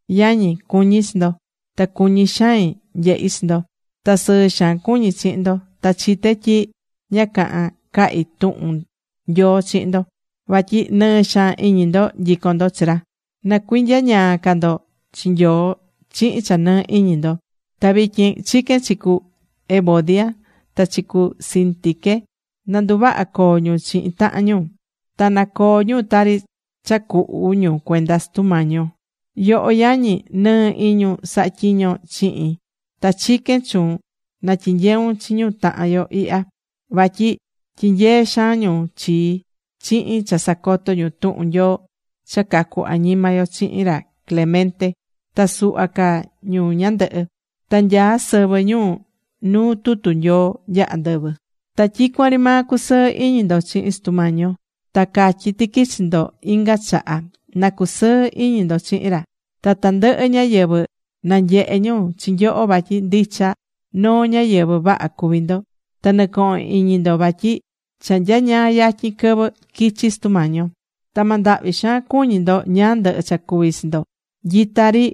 Yañi, cuñí chi ndo. Ta cuñí xain nyehi chi ndo. Ta sɨɨ xaan cuñí chihin ndo. Ta chité tyi ña cahán cahi tuhun Nyoo chihin ndo. Vatyi nɨɨ́ xaan iñi ndo nyicón ndo chi ra. Na cuinyañaa ca ndo chi Nyoo chihin cha nɨɨ́ iñi ndo. Ta vityin chiquén chi cu Evodia, ta chi cu Síntique, nanduvaha coo ñu chihin tahan ñu. Ta na coo ñu tari cha cuhu ñu cuenda Sutu Mañi yo. Yoho, yañi, nɨɨ iñun sahá tyiñon chihin, ta chiquén chuun na tyinyeun chi ñu tahan yo ihya. Vatyi tyinyee̱ xaan ñu chii chihin cha sacoto̱ ñu tuhun Nyoo cha cacu añima yo chihin ra Clemente ta suhva ca ñu ñandɨhɨ. Ta nyaá sɨvɨ ñu nuu tutu Nyoo nya andɨvɨ. Ta tyicuan ri maa cu̱sɨɨ iñi ndo chihin Sutu Mañi yo. Ta catyí tiqui chi ndo inga chaha, na cusɨɨ iñi ndo chihin ra. Ta tandɨhɨ ñáyɨvɨ na nyehe ñu chi nyoho vatyi ndicha noo ñáyɨvɨ vaha cuví ndo. Ta nɨ̱cohon iñi ndo vatyi cha nyañaa yatyin quɨvɨ quichi Sutu Mañi yo. Ta ma ndahvi xaan cuñi ndo ñáá ndɨhɨ cha cuví chi ndo. Nyita ri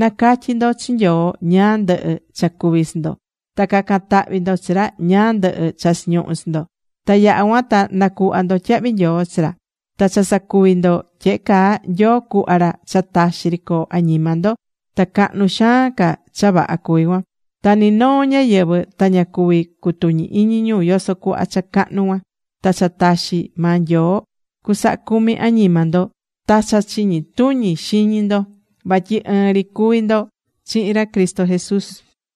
na̱catyi ndo chi Nyoo ñáá ndɨhɨ cha cuví chi ndo. Ta ca̱can tahvi ndo chi ra ñáá ndɨhɨ cha chiñuhú chi ndo. Ta yaha cuan ta nacuhva ndo tyahvi nyoo chi ra. Ta cha sacuví ndo tyehe caa, Nyoo cuhva ra cha taxi ri coo añima ndo. Ta cahnu xaan ca cha vaha cuví cuan. Ta ni noo ñáyɨvɨ ta ña cuví cutuñi iñi ñu yoso cuhva cha cahnu cuan. Ta cha taxi maa Nyoo cusaha cumi añima ndo ta cha chiñi tuñi xiñi ndo. Vatyi ɨɨn ri cuví ndo chihin ra Cristo Jesús.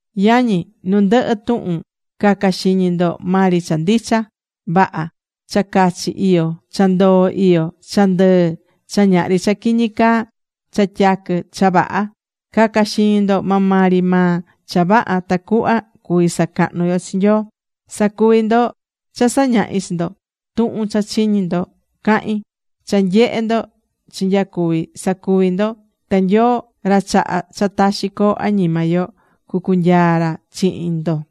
Yañi, nu ndɨhɨ tuhun ca̱ca xiñi ndo maa ri cha ndicha vaha, cha cachi iyó, cha ndoo iyó, cha ndɨɨ, cha ñahri cha quiñi caa, cha tyaquɨ, cha vaha. Ca̱ca xiñi ndo maa maa ri maa cha vaha tacuhva cuví sacahnu yo chi Nyoo. Sa̱cuvi ndo cha sañahi̱ chi ndo. Tuhun cha chiñi̱ ndo cahi̱n, cha nyehe̱ ndo chinyacuvi̱, sa̱cuvi ndo. Ta Nyoo ra chahá cha taxi coo añima yo, cucunyaa ra chihin ndo.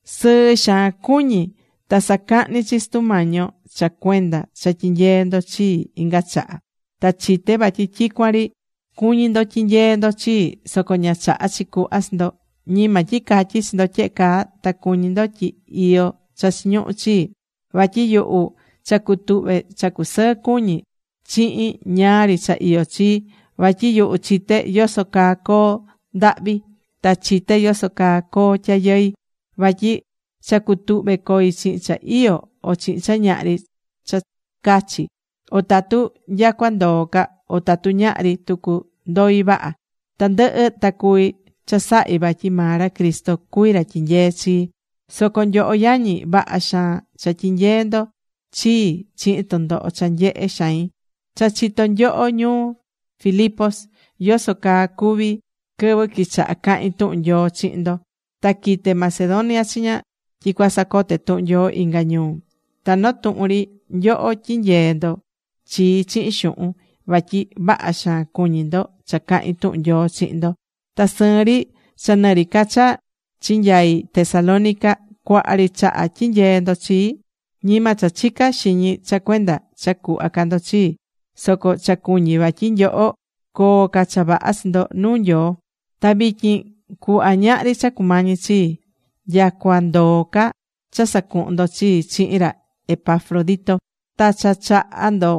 Sɨɨ xaan cuñí. Ta sacahní chi Sutu Mañi yo cha cuenda cha tyinyee̱ ndo chii inga chaha. Ta chité vatyi tyicuan ri cuñí ndo tyinyeé ndo chii. Soco ña chaha̱ chi cuhva chi ndo. Ñima tyi catyí chi ndo tyehe caa ta cuñí ndo tyi iyó cha chiñuhú chii, vatyi yuhu cha cutuhve cha cusɨɨ cuñí chihin ñáá ri cha iyó chi. Vatyi yuhu chité yoso caa coo ndahvi ta chité yoso caa coo tyayɨi. Vatyi cha cutuhve̱ coi chihin cha iyó o chihin cha ñahri cha cachi, o tatu nyacua ndoo ca, o tatu ñahri tucu, ndoi vaha. Tandɨhɨ ta cuví chasahí vatyi maa ra Cristo cuví ra tyineé chii. Soco nyoho yañi vaha xaan cha tyinyee̱ ndo chii chihin tɨndoho cha nyehé xain. Cha chitó nyoho ñu Filipos yoso caa cuvi̱ quɨvɨ quichaha cahin tuhun Nyoo chihin ndo. Ta quite̱ Macedonia chiña tyi cuasacote tuhun Nyoo inga ñuu. Ta noo tuhun ri nyoho tyinyee̱ ndo chii chihin xuhun, vatyi vaha xaan cuñí ndo cha cahín tuhun Nyoo chihin ndo. Ta sɨɨn ri cha nɨ ri ca cha chinyai Tesalónica, cuaha ri chaha tyinyee̱ ndo chii. Ñima cha chicá xiñi cha cuenda cha cuhva ca ndo chii, soco cha cuñí vatyi nyoho coo ca cha vaha chi ndo nuu Nyoo. Ta vityin cuhva, ñahri cha cumañí chii. Nyacua ndoó ca cha sacuhu̱n ndo chii chihin ra Epafrodito. Ta cha chaha̱ ndo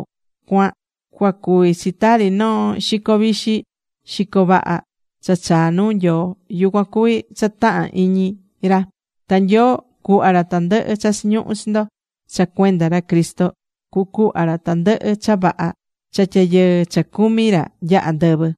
cuan cuacuví chi tari noo xico vixi, xico vaha cha chaá nuu Nyoo. Yucuan cuví cha tahán iñi ra. Ta Nyoo cuhva ra tandɨhɨ cha chiñuhú chi ndo. Cha cuenda ra Cristo cucuhva ra tandɨhɨ cha vaha cha tyayɨɨ cha cumí ra nya andɨvɨ.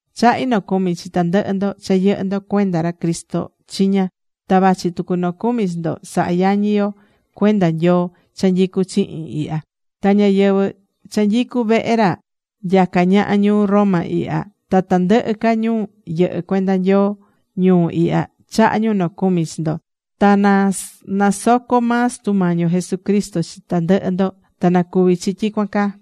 Chahí nocumi chi tandɨhɨ ndo cha yɨhɨ́ ndo cuenda ra Cristo chiña. Ta vachi tucu nocumi chi ndo sahá yañi yo cuenda Nyoo cha nyicú chihin ihya. Ta ñáyɨvɨ cha nyicú vehe ra nyacá ñaha ñuu Roma ihya, ta tandɨhɨ ca ñu yɨhɨ́ cuenda Nyoo ñuu ihya chahá ñu nocumi chi ndo. Ta na nasoco maa Sutu Mañi yo Jesucristo chi tandɨhɨ ndo. Ta na cuvi chi tyicuan caa.